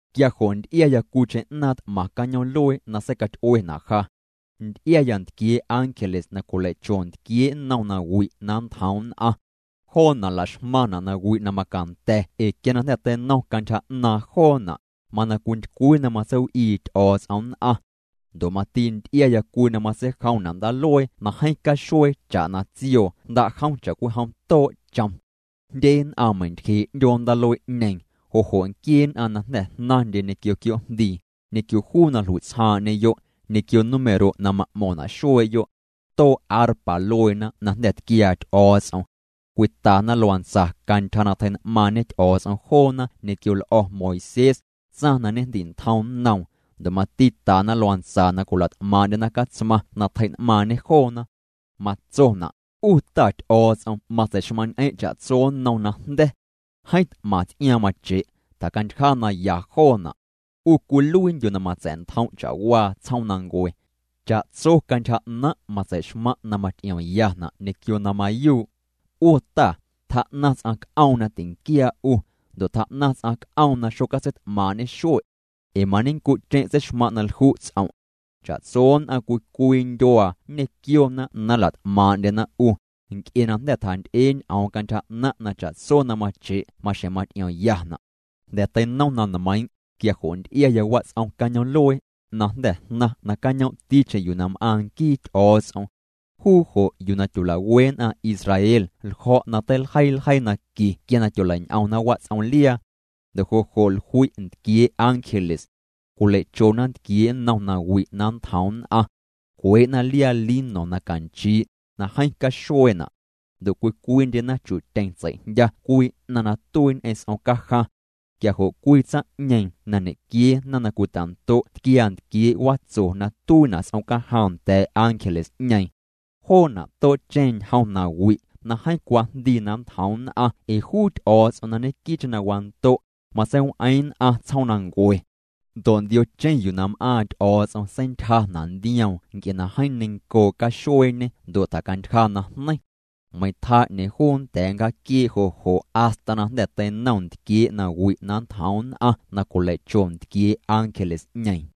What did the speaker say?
Quia jo' nty'iaya cwiicheⁿ 'naaⁿ t'maⁿ cañoom'luee na seicaty'uena' ja. Nty'iaya ntquiee' ángeles na cwilei'cho ntquiee' nnom nawi' na nntjoom nn'aⁿ. Joona' la'xmaⁿna' nawi' na macanda̱ ee quia na jnda̱ teinom cantyja 'naaⁿ joona', mana cwintycwii na matseiw'ii Ty'o̱o̱ts'om nn'aⁿ. Ndo' mati nty'iaya cwii na matseijomna' ndaaluee na jeeⁿ caxuee cha'na tsioo jnda'jom cha'cwijom too' chom. Jndye nn'aⁿ meintyjee' 'ndyoo ndaaluee'ñeeⁿ, jo' jo' nquiee nn'aⁿ na jnda̱ jnaⁿndye ñequio quioo'jndii, ñequio juu na jlui'tsjaaⁿ'ñeyo', ñequio número' na ma'mo̱ⁿna' xuee'yo'. Too' arpa lueena na jnda̱ tquiaa Ty'o̱o̱ts'om. Cwitana luantsa cantyja na tjei'n'maaⁿñe Ty'o̱o̱ts'om joona ñequio l'o̱ Moisés, tsaⁿ na ñejndi'ntjom nnoom, ndo' mati tana luantsa na cwila't'maaⁿ'ndyena Catsmaⁿ na tjei'n'maaⁿñê joona. Matsona': 'U Ta Ty'o̱o̱ts'om matsei'xmaⁿ'ñ'eⁿ' cha'tso nnom najnda̱. Jeeⁿ t'maⁿ ts'iaaⁿ mache', tjacantyja na ya joona'. 'U cwiluiindyu' na matsa̱'ntjom' cha'waa tsjoomnancue. Cha'tso cantyja 'naⁿ' matsei'xmaⁿ' na maty'iomyana' ñequio na mayuu'. 'U Ta, tjaa'naⁿ ts'aⁿ c'oom na tinquiaa' 'u, ndo' tjaa'naⁿ ts'aⁿ c'oom na xocatseit'maaⁿ'ñe xue'. Ee mañenncu'cheⁿ' tseixmaⁿ' na lju' ts'om'. Cha'tso nn'aⁿ cwii cwii ndyuaa nñequiona na nla't'maaⁿ'ndyena 'u, nc'e na jnda̱ tjanty'ee ñ'oom cantyja 'naⁿ' na cha'tso na mache' maxjeⁿ maty'iomyana'. Jnda̱ teinom na nmeiiⁿ', quia jo' nty'iaya wats'om cañoom'luee, na jnda̱ jnaⁿ nacañoomticheⁿ yuu na m'aaⁿ nquii Ty'o̱o̱ts'om. Juu jo' yuu na tyola'we nn'aⁿ Israel ljo̱' na teiljeii ljeii naqui quia na tyolei'ñ'omna wats'omliaa. Ndo' jo' jo' jlui' ntquiee' ángeles. Cwilei'chona ntquiee' nnom nawi' na nntjoom nn'aⁿ. Cwee'na liaa lino na canchii', na jeeⁿ caxueena'. Ndo' cwii cwiindyena chu'tyeⁿ tsei'jndya cwii 'naⁿ na tuii ñ'eⁿ s'omcajaⁿ. Quia jo' cwii tsaⁿ'ñeeⁿ na ñequiee na cwita'ndo' tquiaa ntquiee' watso na tuiina' s'omcajaⁿ nda̱a̱ ángeles'ñeeⁿ. Joona' too'cheⁿ ñjom nawi' na jeeⁿ cwajndii na nntjoom nn'aⁿ ee juu Ty'o̱o̱ts'om na ñequii'cheⁿ na wando', matseiw'eeⁿ nn'aⁿ tsjoomnancue. Ndo' ndiocheⁿ yuu na m'aaⁿ Ty'o̱o̱ts'om seintyjana' ndioom nc'e na jeeⁿ neiⁿncoo' caxueeñê ndo' tjacantyja najneiⁿ. Meiⁿ tjaa 'ñeeⁿ juu nnda̱a̱ nncjaaquiee' jo' jo' hasta na jnda̱ teinom ntquiee' nawi' na nntjoom nn'aⁿ na cwilei'cho ntquiee' ángeles'ñeeⁿ.